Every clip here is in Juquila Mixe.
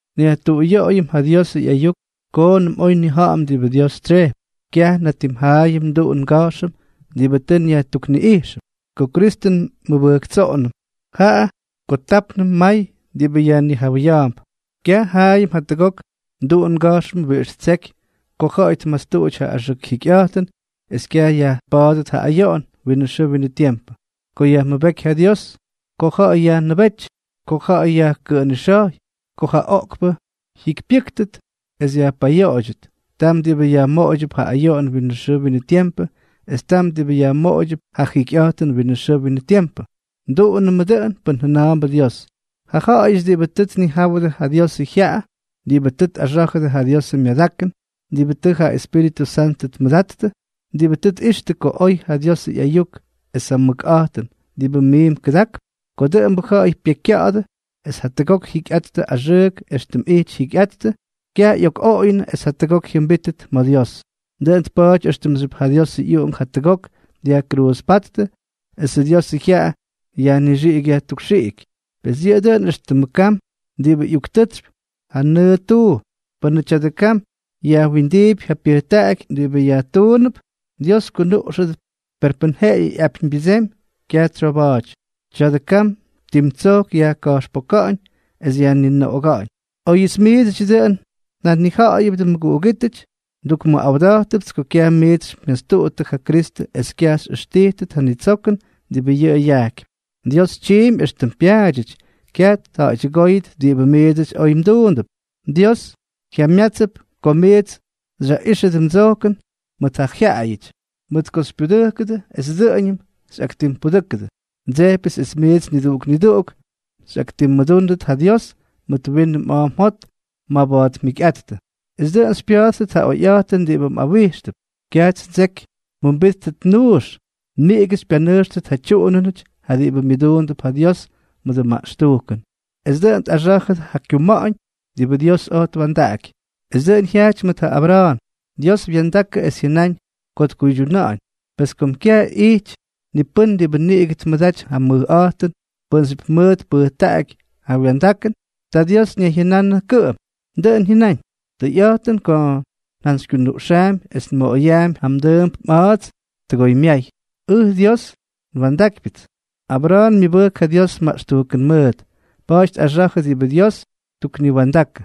Nyajtuꞌuyoꞌoyʉm ja Diosʉ ꞌyayuk koonʉm oy nnija̱ꞌa̱m diꞌibʉ Dios tsyejpy. Kyaj natim jaꞌayʉm nduꞌun nga̱jxʉm diꞌibʉ tʉ nyajtukniꞌijxʉm ko Kristʉ nmʉbʉjktsoꞌonʉm, jaꞌa ko tápnʉm may diꞌibʉ yajnijawʉya̱a̱mp. Kyaj jaꞌayʉm jatʉgok nduꞌun nga̱jxʉm wiꞌix ttseky ko ja̱ꞌa̱y tmatstuꞌuty ja axʉk jikyꞌa̱jtʉn es kyaj yajpa̱a̱dʉt ja ayoꞌon winʉ xʉʉ winʉ tiempʉ, ko yajmʉbéky ja Dios, ko ja̱ꞌa̱y yajnʉbéty, ko ja̱ꞌa̱y yajkʉꞌʉnixa̱jy, ko ja oꞌkpʉ jyikypyʉ́ktʉt es yajpayoꞌoydyʉt, tam diꞌibʉ yajmoꞌoydyʉp ja ayoꞌon winʉ xʉʉ winʉ tiempʉ es tam diꞌibʉ yajmoꞌoydyʉp ja jikyꞌa̱jtʉn winʉ xʉʉ winʉ tiempʉ. Nduꞌunʉmʉ dʉꞌʉn pʉn jʉna̱a̱mbʉ Dios. Ja ja̱ꞌa̱yʉty diꞌibʉ tʉ tnijáwʉdʉ ja Diosʉ jyaꞌa, diꞌibʉ tʉ tꞌaxá̱jʉdʉ ja Diosʉ myadakʉn, diꞌibʉ tʉ ja Espíritʉ Santʉ tmʉdattʉ, diꞌibʉ tʉ tꞌixtʉ ko oy ja Diosʉ ꞌyayuk es ja mʉkꞌa̱jtʉn diꞌibʉ miimp kʉdakp, ko dʉꞌʉmbʉ ja̱ꞌa̱y pyekykya̱ꞌa̱dʉ es jatʉgok jyikyꞌattʉ axʉʉk éxtʉm ꞌyijty jyikyꞌattʉ, kyaj ꞌyokꞌoꞌoyʉnʉ es jatʉgok jyʉmbítʉt ma̱ Dios. Dʉꞌʉn tpa̱a̱ty éxtʉmxyʉp ja Diosʉ ꞌyUꞌunk jatʉgok dyajkruuzpáttʉ esʉ Diosʉ jyaꞌa yajnixiꞌiky yajtukxiꞌiky. Pes yʉꞌʉ dʉꞌʉn éxtʉmʉ kam diꞌibʉ ꞌyuktʉtsypy ja nʉʉ tuu. Pʉnʉ tya̱dʉ kam yajwindiipy ja pyʉjtaꞌaky diꞌibʉ yajtuunʉp, Dios kunuꞌxʉdʉp; per pʉn jeꞌeyʉ ꞌyapyñbyʉdsemy, kyaj tsyoba̱a̱ty. Tya̱dʉ kam tim tsojk yajka̱jxpoka̱ꞌa̱ñ es yajninoꞌoga̱ꞌa̱ñ. Oyʉts miidsʉdyʉ dʉꞌʉn njanija̱ꞌa̱yʉbʉdʉ, mʉguꞌugítʉty, ndukmʉꞌawda̱jtʉpts ko kyaj miits xymyastuꞌuttʉ ja Kristʉ es kyaj xyꞌʉxtijtʉt ja nitsokʉn diꞌibʉ yʉꞌʉ yajkypy. Dios tyiimpy éxtʉm pyaadyʉty; kyaj tja̱ꞌa̱ydyʉgóyʉt diꞌibʉ miidsʉty oy mduundʉp. Dios jyamyátsʉp ko miits xyaꞌijxʉdʉ mdsojkʉn mʉt ja jyaꞌayʉty, mʉt ko xypyudʉjkʉdʉ es dʉꞌʉñʉm xyꞌaktimpudʉ́kʉdʉ. Ndsejpyʉts es miits niduꞌuk niduꞌuk xyꞌaktimmʉdúndʉt ja Dios mʉt winʉ mꞌa̱a̱ mjot maba̱a̱t mjikyꞌattʉ, es dʉꞌʉn xypya̱a̱ttʉt ja oyꞌa̱jtʉn diꞌibʉ mꞌawíxtʉp. Kyajts ndseky mjʉmbítʉt nuux, niꞌigʉ xypyanʉjxtʉt ja tyuꞌunʉnʉty ja diꞌibʉ myʉduundʉp ja Dios mʉdʉ maꞌxtujkʉn, es dʉꞌʉn tꞌaxá̱jʉdʉ ja kyuma̱ꞌa̱ñ diꞌibʉ Dios oj twa̱ndaꞌaky. Es dʉꞌʉn jyajty mʉt ja Abra̱a̱n. Dios wa̱ndakʉ es jyʉnáñ ko tkuydyuna̱ꞌa̱ñ. Pes kom kyaj ꞌyity ni pʉ́n diꞌibʉ niꞌigʉ tmʉdaty ja mʉjꞌa̱jtʉn pʉ́nxyʉp mʉʉt tpʉjtaꞌaky ja wa̱ndakʉn, ta Dios ñayjyʉnanʉ kʉꞌʉm. Dʉꞌʉn jyʉnáñ: “Tʉyꞌa̱jtʉn ko njantsykyunuꞌxaampy es nmoꞌoyaampy ja mdʉʉmp mꞌa̱a̱ts tʉgoymyay. Ʉj Dios, nwa̱ndákypyʉts.” Abra̱a̱n myʉbʉjk ja Dios maꞌxtujkʉn mʉʉt, pa̱a̱ty tꞌaxa̱jʉ diꞌibʉ Dios tukniwa̱ndakʉ.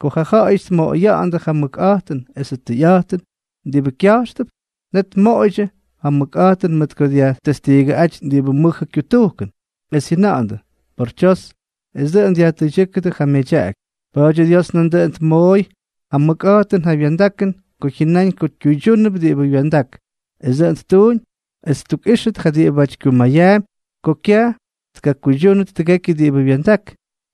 Ko ja ja̱ꞌa̱yʉty tmoꞌoya̱ꞌa̱ndʉ ja mʉkꞌa̱jtʉn esʉ tʉyꞌa̱jtʉn diꞌibʉ kya̱jxtʉp, net tmoꞌoydyʉ ja mʉkꞌa̱jtʉn mʉt ko dyajtestiigʉꞌáty diꞌibʉ mʉjʉ kyutujkʉn, es jyʉna̱ꞌa̱ndʉ: “¡Por tsyos!”, es dʉꞌʉn dyajtʉydyʉ́kʉdʉ ja myadyaꞌaky. Pa̱a̱dyʉ Dios nandʉꞌʉn tmooy ja mʉkꞌa̱jtʉn ja wya̱ndakʉn ko jyʉnáñ ko kyuydyúnʉp diꞌibʉ wya̱ndak. Es dʉꞌʉn ttuuñ es ttukꞌíxtʉt ja diꞌibáty kyumayaampy ko kyaj tkakuydyúnʉt tʉgekyʉ diꞌibʉ wya̱ndak,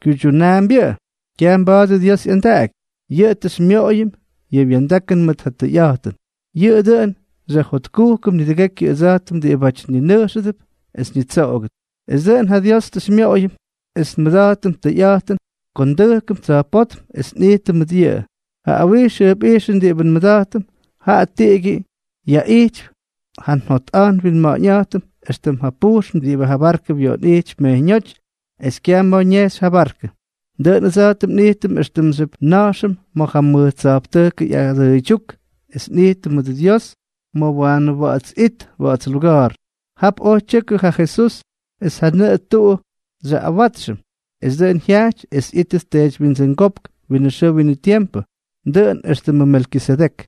kyuydyunaambyʉꞌʉ. Kyaj mba̱a̱dʉ Dios ꞌyandaꞌaky. Yʉꞌʉ tʉ xymyoꞌoyʉm yʉ wya̱ndakʉn mʉt ja tʉyꞌa̱jtʉn. Yʉꞌʉ dʉꞌʉn xyajjotkujkʉm nidʉgekyʉ ʉdsa̱jtʉm diꞌibáty ninʉjxʉdʉp es ñitsoꞌogʉt, es dʉꞌʉn ja Dios tʉ xymyoꞌoyʉm es nmʉda̱jtʉm tʉyꞌa̱jtʉn ko ndʉjkʉm tsa̱jpótm es nꞌijtʉm mʉt yʉꞌʉ. Ja awijx jʉjpꞌijxʉn diꞌibʉ nmʉda̱jtʉm, jaꞌa tiꞌigyʉ yaꞌijtypy ja njotꞌa̱jt nwinma̱ꞌa̱ñꞌa̱jtʉm éxtʉm ja pujxn diꞌibʉ ja barkʉ wyoꞌonꞌijtypy mejyñóty es kyaj ma̱ ñejxy ja barkʉ. Dʉꞌʉn ʉdsa̱jtʉm nꞌijtʉm éxtʉmxyʉp nna̱jxʉm ma̱ ja mʉj tsa̱jptʉjkʉ ꞌyadʉʉydyúk es nꞌijtʉm mʉdʉ Dios ma̱ Waanʉ Wa̱ꞌa̱ts It Wa̱ꞌa̱ts Luga̱a̱r. Jap oj tyʉkʉ ja Jesús es ja nʉꞌʉ tuꞌu xyaꞌꞌawátsxʉm, esʉ dʉꞌʉn jyajty es ꞌyítʉt teedywyindsʉngópk winʉ xʉʉ winʉ tiempʉ, dʉꞌʉn éxtʉmʉ Melkisedek.